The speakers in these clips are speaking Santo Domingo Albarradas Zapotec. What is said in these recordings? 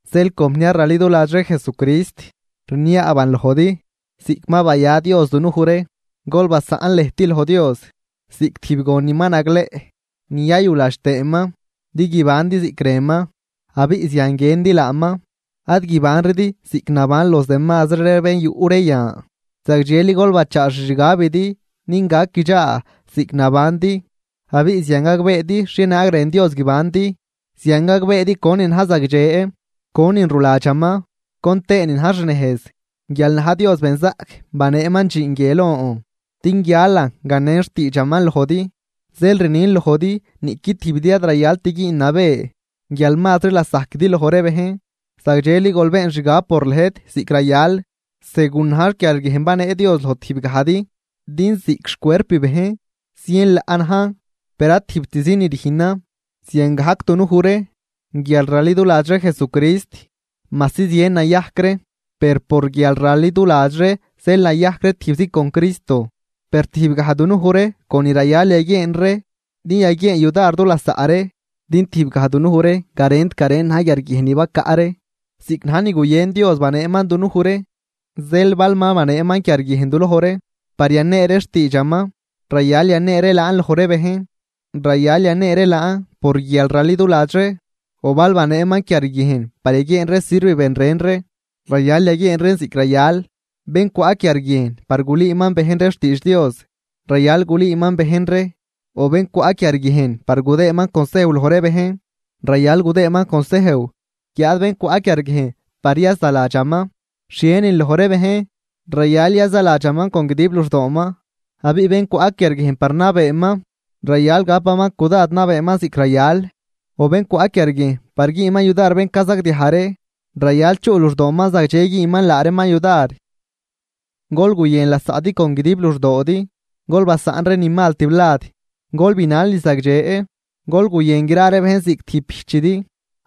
Zeel compniar raliduladx ree Jesucrist, rniaaban lojdi, ziꞌc ma baya Dios dunuj ree, gol basaꞌn lëjt loj Dios ziꞌc tijb gon ni ma nagleꞌ ni yayuladx tëëman, din guibandi ziꞌc rënman, abiꞌ zian guiëndi laaman. Ad guibanridi ziꞌc naban los demazri ree bén yuꞌ ree yan, zagdxeli gol bachaa xixgabidi din gac guidxaa ziꞌc nabandi abiꞌ zian gagbeedi xhienaag rën Dios guibandi. Zian gagbeedi conin na̱j zagdxe, conin ruladxaman, con tëënin na̱j xnejz. Guial na̱j Dios benzaꞌc baneeman dxiin guie lon din guialan ganen xtiidxaman lojdi. Zeel rnin lojdi niꞌqui tijbidi ad rayalt güün nabë guial mazri lasajquidi loj ree bejn. Zagdxeli gol been xgab por lëjt ziꞌc rayal, segun na̱j quiarguiejn ni banee Dios loj tijbgajdi. Din ziꞌc xcuerp bejn zien laꞌ najn, per ad tijbtzi ni rüjnan. Ziangajc dunuj ree guial raliduladx ree Jesucrist, majsi zien nayajc ree, per por guialraliduladx ree zeel nayajc ree tijbzi con Cristo, per tijbgaj dunuj ree con ni rayal yaguieen ree din yaguieen yudar du lasaꞌ ree. Din tijbgaj dunuj ree garent garen na̱j quiarguiejn ni bacaꞌ ree, ziꞌc na̱j ni guyën Dios baneeman dunuj ree. Zeel bal ma baneeman quiarguiejn du loj ree par yanee ree xtiidxaman, rayal yanee ree laan loj ree bejn, rayal yanee ree laan por guialraliduladx ree. O bal baneeman quiarguiejn par yaguieen ree sirv ben ren ree, rayal yaguieen reen ziꞌc rayal. Bén cwaꞌ quiarguiejn par gulüüman bejn ree xtiidx Dios, rayal gulüüman bejn ree. O bén cwaꞌ quiarguiejn par gudëëman consejw loj ree bejn, rayal gudëëman consejw. Guiáad bén cwaꞌ quiarguiejn par yazaladxaman xhienin loj ree bejn, rayal yazaladxaman con guidib luxdooman. Abiꞌ bén cwaꞌ quiarguiejn par nabeeman, rayal gapaman cudad nabeeman ziꞌc rayal, o bén cwaꞌ quiarguiejn par güünman yudar bén cazagdiaj ree, rayal chuꞌ luxdooman zagdxe güünman laa reeman yudar. Gol guyën lasaꞌdi con guidib luxdoodi, gol basaꞌn ree ni mal tiblad, gol binal ni zagdxe. Gol guyën gra ree bejn ziꞌc tijb bijchidi,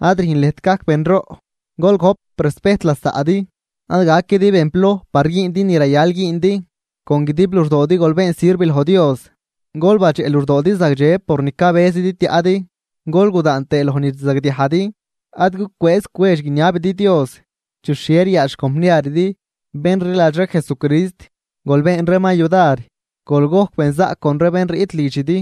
ad rüjn lëjt gajc benroꞌ, gol gojp respejt lasaꞌdi. Ad gaquidi bén ploj par güündi ni rayal güündi, con guidib luxdoodi gol been sirv loj Dios. Gol badxeꞌ luxdoodi zagdxe por ni cabëzidi tiaꞌdi, gol gudaan tëë loj ni rzagdiajdi, ad gucwëëz cwedx guiniabidi Dios. Chi xhie ryaadx xcompniaridi, bén rliladx ree Jesucrist, gol been reeman yudar. Gol gojc benzaꞌc con ree bén riꞌt lidxidi.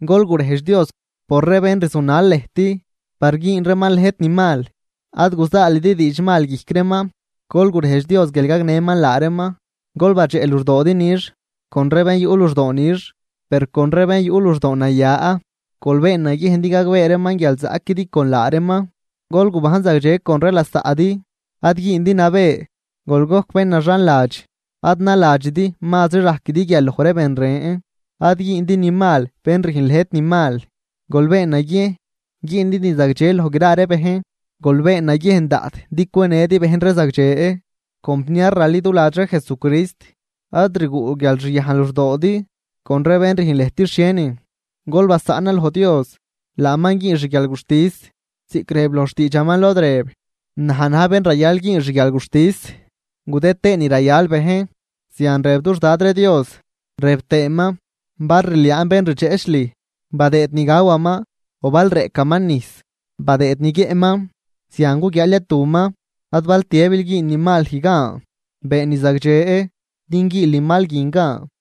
Gol gurejdx Dios por ree bén rzunal lëjt par güün reeman lëjt ni mal, ad guzaalidi diidxmal guijc reeman, gol gurejdx Dios guial gagnëman laa reeman. Gol badxeꞌ luxdoodi nix con ree bén yuꞌ luxdoo nix, per con ree bén yuꞌ luxdoo naya, gol been naguiejn din gagbee reeman guial zaꞌquidi con laa reeman. Gol gubajn zagdxe con ree lasaꞌdi, ad güündi nabë, gol gojc bén naxanladx. Ad naladxidi mazri rajquidi guial loj ree ben ren. Ad güündi ni mal bén rüjn lëjt ni mal, gol been naguiejn güündi ni zagdxe loj gra ree bejn. Gol been naguiejn daꞌt din cwenëdi bejn ree zagdxe. Compniar raliduladx ree Jesucrist, ad rguꞌ guialxyajn luxdoodi con ree bén rüjn lëjt xhienin, gol basaꞌnan loj Dios, laaman güün xguialguxtis, ziꞌc rëb loj xtiidxaman, lod rëb: “Naj na̱j bén rayal güün xguialguxtis, gudë tëën ni rayal bejn. Zian rëb dux Dad ree Dios.” Rëb tëëman: “Bal rliaan bén rdxeꞌch lüj, badëëd ni gawaman, o bal reꞌcaman nijs, badëëd ni guiëꞌman, zian guguiaal yatuman.” Ad bal tiëbil güün ni mal lüj gan, been ni zagdxe din güünl ni mal guin gan.